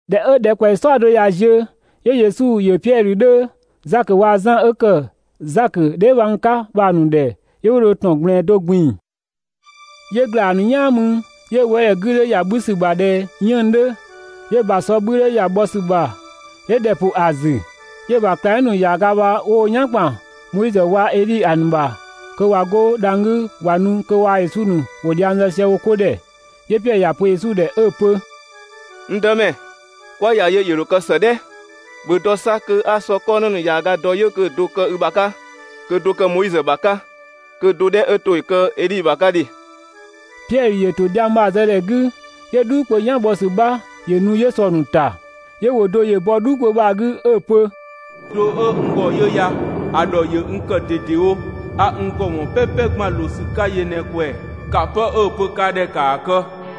꞊Dhɛ 'ö ‑dhɛkpaɔyi "saɔdo ꞊ya ziö, 'yö Yesu ‑yö Piɛdhö 'dhö, Zakö waa‑ Zan 'ö ‑kë Zakö dheebhang 'ka bha‑ ‑nu ‑dhɛ 'yö 'wo dho ‑tɔn ꞊gblɛɛn do ꞊gbin‑. 'Yö‑ ‑gla ‑a ‑nu "yaan mü, 'yö‑ wëëdhɛ 'gü 'dhö ‑ya 'bhü ‑sü ‑bha ꞊dhɛ 'yënng‑ 'dhö, 'yö‑ ‑bha ‑sɔ 'bhü 'dhö ‑ya bhɔ ‑sü ‑bha 'yö ‑dhɛ ‑pʋ ‑a ‑zü. 'Yö‑ ‑bha ꞊klangdhiʋ̈ ‑nu ‑yaaga bha 'wo wo "yan ‑kpan Moizö waa‑ Edhi ‑a ‑nu ‑bha (kö ꞊wa 'go dhang‑ 'gü ꞊wa nu) kö waa‑ Yesu ‑nu ‑wo dhiang zë sië wo 'ko ‑dhɛ. 'Yö Piɛdhö ‑ya pö Yesu ‑dhɛ 'ö‑ pö: «N Dëmɛ, 'kwa ‑ya yö ‑yö ‑dho kë ‑së "dhɛ! ‑Bhö dɔ 'sa kö 'a sɔ 'kɔ 'në ‑nu ‑yaaga dɔ 'yö kö‑ do‑ kë i ‑bha 'ka, kö‑ do‑ kë Moizö ‑bha 'ka, kö‑ do 'dhɛ 'ö to ‑yö kë Edhi ‑bha 'ka ‑dhe! Piɛdhö ‑yö ‑to dhiang bha‑ zë ‑dhɛ 'gü, 'yö "dhuu kpö "yan bhɔ ‑sü 'bha ‑yö nu 'yö sɔ‑ ‑nu ‑ta, 'yö ‑wʋ do ‑yö bɔ "dhuu kpö bha‑ 'gü 'ö‑ pö: «N Gbö (do 'ö n ‑gɔ) 'yö ya ‑a ‑dhɔ ‑yö n ‑kë ꞊dedewo, 'a n ‑gɔ ‑wɔn "pɛpɛ ꞊gban ꞊loo ‑sü 'ka yö ꞊në‑ ꞊kwɛɛ‑. ꞊Ya 'pë 'ö‑ pö ka ‑dhɛ ‑kaa kë.»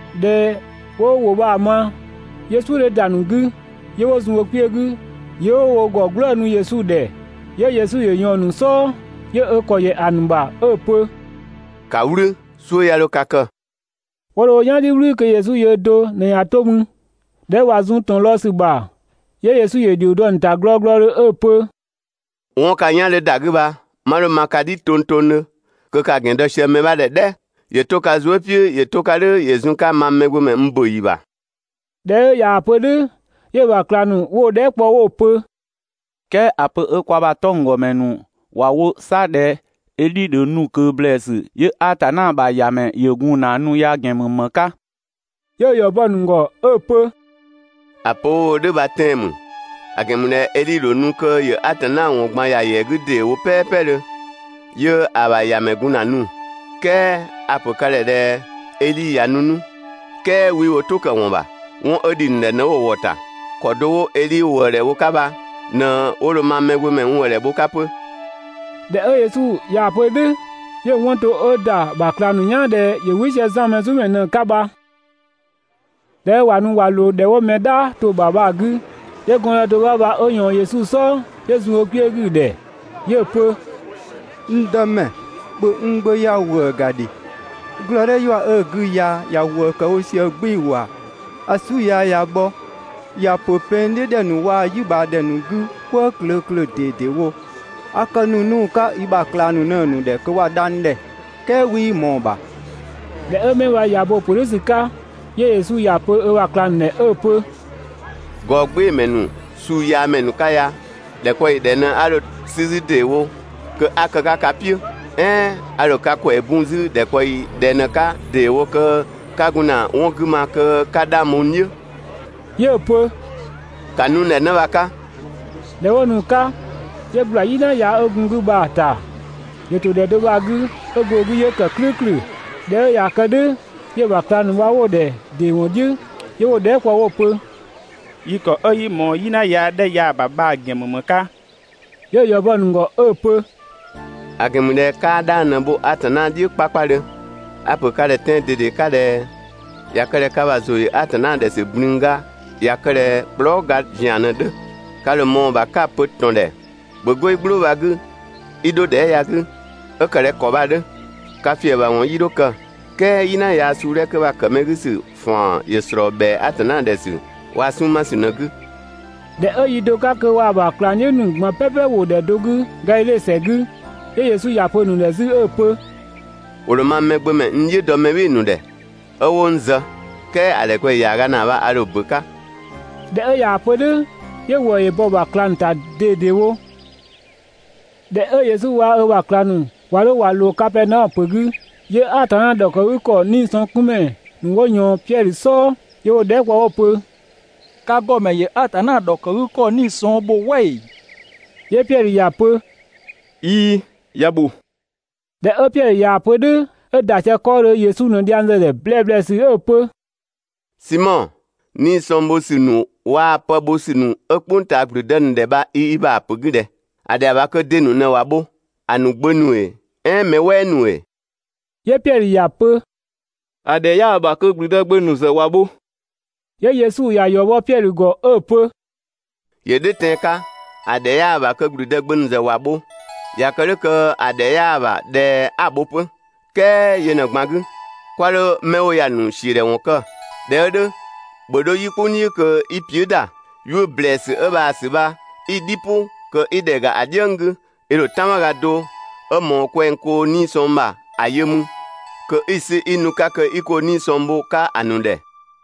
꞊Dhɛ 'wo ‑wʋ bha‑ ma, 'yö "suʋ̈ 'dhö ‑da ‑nu 'gü 'yö 'wo zun wo kpiö 'gü 'yö 'wo wo ‑gɔ "gblëënu Yesu ‑dhɛ. 'Yö Yesu ‑yö ꞊yɔɔn‑ ‑nu "sɔɔ, 'yö ö ‑kɔ ‑yɛ ‑a ‑nu ‑bha 'ö‑ pö: «‑Ka "wlü, "suʋ̈ 'ya 'dho ka kë!» 'Wo dho wo "yan "dhiʋ̈ "wlü kö Yesu yöö do ꞊në ꞊ya 'to mü. ꞊Dhɛ 'ö ꞊wa zun ‑tɔn lɔɔ‑ ‑sü ‑bha, 'yö Yesu ‑yö ‑dhio dɔ‑ ‑nu ‑ta glɔglɔdhö 'ö‑ pö: «'Wɔn ka "yan 'dhö ‑da 'gü bha, 'ma 'dho‑ ma ka "dhi tongtongdhö kö ka‑ ‑gɛn dɔ sië mɛ 'bha ‑dhɛ "dhɛ! ‑Yö 'to ka zuë" "piʋ̈ ‑yö 'to‑ ka "dhʋ̈ ‑yö zun‑ 'ka mang Mɛgbömɛ n ‑bö ‑yi ‑bha.» ꞊Dhɛ 'ö ꞊yaa‑ pö "dhʋ̈, 'yö‑ ‑bha ꞊klang ‑nu 'wo‑ dhɛɛ" kpɔ 'wo‑ pö: «"Kɛɛ ‑a pö 'ö kwa ‑bha 'tɔnggɔmɛ ‑nu ‑wa wo 'sa ꞊dhɛ Edhi ‑dho nu ꞊kö ‑blɛɛsü, 'yö Atanna ‑bha ‑Yamɛ ‑yö gun ‑na nu ya‑ ‑gɛn ‑mü ‑më 'ka?» 'Yö‑ ‑yɔ bɔ‑ ‑nu ‑gɔ 'ö‑ pö: «‑A pö 'wo‑ wo "dhʋ̈ bha tɛan‑ ‑mü, ‑a ‑gɛn ‑mü ꞊dhɛ Edhi ‑dho nu kö ‑yö Atanna ‑wɔn ꞊gban ‑ya ‑yɛa 'gü ‑deewo ("pɛpɛdhö, 'yö ‑a ‑bha ‑Yamɛ gun ‑na nu). "Kɛɛ a‑ ‑pö ka ‑dhɛ ꞊dhɛ Edhi ꞊ya nu 'nu, "kɛɛ 'wii wo "tʋ këwɔn ‑bha 'wɔn 'ö ‑dhi ‑nu ‑dhɛ ꞊në 'wo‑ ‑wɔ ‑ta. ‑Kɔ do 'wo Edhi ‑wëëdhɛ bho‑ 'ka bha ꞊në 'wo dho mang Mɛgbömɛ n ‑wëëdhɛ bho‑ 'ka 'pö. ꞊Dhɛ 'ö Yesu ꞊yaa‑ pö "dhʋ̈, 'yö‑ 'wɔn to 'ö ‑da ‑bha ꞊klang ‑nu "yaan ꞊dhɛ ‑yö "wɩ sië Zan Mɛzumɛ ꞊në‑ 'ka bha. ꞊Dhɛ 'ö ꞊wa nu ꞊wa ꞊loo ‑dhɛ 'wo mɛ "dhaa to‑ ‑bha bha‑ 'gü, 'yö gɔndë do 'bha bha 'ö ꞊yɔɔn Yesu "sɔɔ, 'yö zun ö kpiö 'gü‑ ‑dhɛ. 'Yö‑ pö: «N Dëmɛ, ‑bhö n gbö ya‑ ‑wëë ‑ga ‑dhe. Glɔɔ "dhɛ ‑yua 'ö‑ 'gü ya ‑ya ‑wëë ‑kë wo sië "gbɩɩ‑ ‑wa. (‑A "su yaa ꞊ya bhɔ,) ‑ya ‑pö pɛng "dhiʋ̈ ‑dhɛ ‑nu waa‑ "yi ꞊bhaa ‑dhɛ ‑nu 'gü "kwëë klö klö ꞊dedewo. A kë ‑nu 'nu‑ 'ka i ‑bha ꞊klang ‑nu ꞊në‑ ‑nu ‑dhɛ kö ‑wa dha n ‑dhɛ, "kɛɛ 'wii ꞊mɔɔ‑ ‑bha.» ꞊Dhɛ 'ö 'mɛ bha ꞊ya bo‑ ‑pö "dhʋ̈ ‑sü 'ka, 'yö Yesu ‑ya pö ö ‑bha ꞊klang ‑nu ‑dhɛ 'ö‑ pö: «Gɔɔgbɩɩmɛ ‑nu, suuyaamɛ ‑nu 'ka ya! ‑Dhɛkpaɔyi ꞊dhɛ ꞊në 'a dho 'sü 'zü ‑deewo kö 'a‑ kë ka "piʋ̈? "Ɛɛn a ‑dho ka ‑kwɛɛ bun 'zü ‑dhɛkpaɔyi ꞊dhɛ ꞊në 'ka ‑deewo kö 'ka gun ‑na 'wɔn 'gü ma kö 'ka 'dhang bho n "dhiʋ̈? 'Yö‑ pö ‑ka nu n ‑dhɛ 'në bha‑ 'ka!» ꞊Dhɛ 'wo nu‑ 'ka, 'yö ꞊gbla "yina yaa 'ö gun‑ bha‑ 'gü bha‑ ‑ta. ‑Yö ‑to ‑dhɛ do bha‑ 'gü 'ö go‑ 'gü 'yö ‑kë "klʋ̈ʋ̈klʋ̈. ꞊Dhɛ 'ö ꞊ya kë "dhʋ̈ 'yö‑ ‑bha ꞊klang ‑nu bha 'wo‑ ‑dhɛ ‑dɩ ‑wɔn "dhiʋ̈ 'yö 'wo‑ dhɛɛ" kpɔ 'wo‑ pö: «Yi ‑kɔ 'ö 'yii ꞊mɔɔ "yina yaa 'dhɛ ya‑ ‑bha bha‑ ‑gɛn ‑mü ‑më 'ka?» 'Yö‑ ‑yɔ bɔ‑ ‑nu ‑gɔ 'ö‑ pö: «‑A ‑gɛn ‑mü ꞊dhɛ 'kaa 'dhang ꞊në‑ bho Atanna "dhiʋ̈. A‑ ‑pö ka ‑dhɛ tɛan‑ ꞊dede 'ka ꞊dhɛ: ꞊Ya kë ꞊dhɛ ka ‑bha ‑zʋ ‑yö Atanna ‑dhɛ ‑sü ꞊blünga ꞊ya kë ꞊dhɛ kplɔɔ" ga ‑zian ꞊në‑ 'dhö, ka ‑dho ꞊mɔɔ‑ ‑bha 'ka‑ pö ‑tɔn ‑dhɛ: ‹‑Bhö 'go i "gblʋʋ bha‑ 'gü 'i 'dho ‑dhɛ ya‑ 'gü!› 'ö ‑kë ꞊dhɛ ‑kɔ bha‑ 'dhö. Ka ‑fiëbhawɔn 'yii dho kë.» ["Kɛɛ "yina yaa suu 'dhɛ 'kö bha‑ ‑kë mɛ 'gü ‑sü ‑faan ‑yö ‑slɔɔ ‑bhɛa Atanna ‑dhɛ ‑sü waa‑ 'sunng‑ 'ma ‑sü ꞊në‑ 'gü.] ꞊Dhɛ 'ö yi do 'ka kö waa‑ ‑bha ꞊klang "dhiʋ̈ ‑nu ꞊gban "pɛpɛ ‑wo ‑dhɛ do 'gü Gadhidhe ‑sɛ 'gü, 'yö Yesu ‑ya pö‑ ‑nu ‑dhɛ 'zü 'ö‑ pö: «‑Wo ‑dho mang Mɛgbömɛ n "dhiʋ̈ dɔ mɛ "bhɩɩ‑ ‑nu ‑dhɛ 'ö 'wo n zë. "Kɛɛ ‑a ‑dhɛkpaɔyi ‑yaaga ‑naa bha, a ‑dho ‑bö 'ka.» ꞊Dhɛ 'ö ꞊yaa‑ pö "dhʋ̈, 'yö ‑wëë ‑yö bɔ‑ ‑bha ꞊klang ‑nu bha‑ ‑nu ‑ta ꞊dedewo. ꞊Dhɛ 'ö Yesu waa‑ ö ‑bha ꞊klang ‑nu ꞊wa 'dho ꞊wa ꞊loo Kapɛɛnaɔmö ‑pö 'gü, 'yö Atanna ‑dhɔkëgükɔ 'niisɔngkunmɛ ‑nu 'wo ꞊yɔɔn Piɛdhö "sɔɔ 'yö 'wo‑ dhɛɛ" kpɔ 'wo‑ pö: «Ka ‑gɔmɛ ‑yö Atanna ‑dhɔkëgükɔ 'nii‑ sɔng ‑bho "wɛ ‑ee?» 'Yö Piɛdhö ‑ya pö: «꞊Iin, ‑ya ‑bho.» ꞊Dhɛ 'ö Piɛdhö ꞊yaa‑ pö "dhʋ̈, 'ö ‑da sië 'kɔɔdhö, Yesu ꞊në dhiang zë‑ ‑dhɛ ‑blɛblɛsü 'ö‑ pö: «Simɔ, 'nii‑ sɔng bho ‑sü ‑nu waa‑ pë bho ‑sü ‑nu 'ö "kpʋng ꞊taa ‑gblüdë ‑nu ‑dhɛ bha i i ‑bha ‑pö 'gü ꞊dhɛ? ‑A ‑dhɛa ‑bha kö de ‑nu ꞊në ‑wa bho, ‑a ‑nu gbö ‑nu ‑ee, "ɛɛn mɛ "wɛɛ ‑nu ‑ee?» 'Yö Piɛdhö ‑ya pö: «‑A ‑dhɛ 'yaa‑ ‑bha kö ‑gblüdë gbö ‑nu ‑zë ‑wa bho.» 'Yö Yesu ‑ya ‑yɔ bɔ Piɛdhö ‑gɔ 'ö‑ pö: «‑Yö "dhʋ̈ tɛan‑ 'ka, ‑a ‑dhɛ 'yaa‑ ‑bha kö ‑gblüdë gbö ‑nu ‑zë ‑wa bho (꞊ya kë "dhʋ̈ kö‑ ‑dhɛ 'yaa‑ ‑bha ꞊dhɛ 'a‑ ‑bho 'pö).» "Kɛɛ yö ꞊në‑ ꞊gban 'gü, 'kwa 'dho 'mɛ 'wo ya‑ ‑nu ‑siödhɛwɔn kë, ꞊dhɛ 'ö "dhʋ̈, ‑bhö 'dho "yi "kpʋng "dhiʋ̈ kö 'i piʋ̈" ‑da, 'yuʋ̈‑ ‑blɛɛsü 'ö bhaa‑ ‑sü bha 'i‑ "dhi "pʋ kö 'i ‑dhɛ ‑ga ‑a "dhiëng 'gü, i ‑dho "tanmaga do 'ö ꞊mɔɔ kwɛng koo‑ 'nii‑ sɔng ‑bha ‑a yö 'mü kö 'i‑ 'sü 'i nu‑ 'ka kö 'i koo 'nii‑ sɔng bho‑ 'ka ‑a ‑nu ‑dhɛ.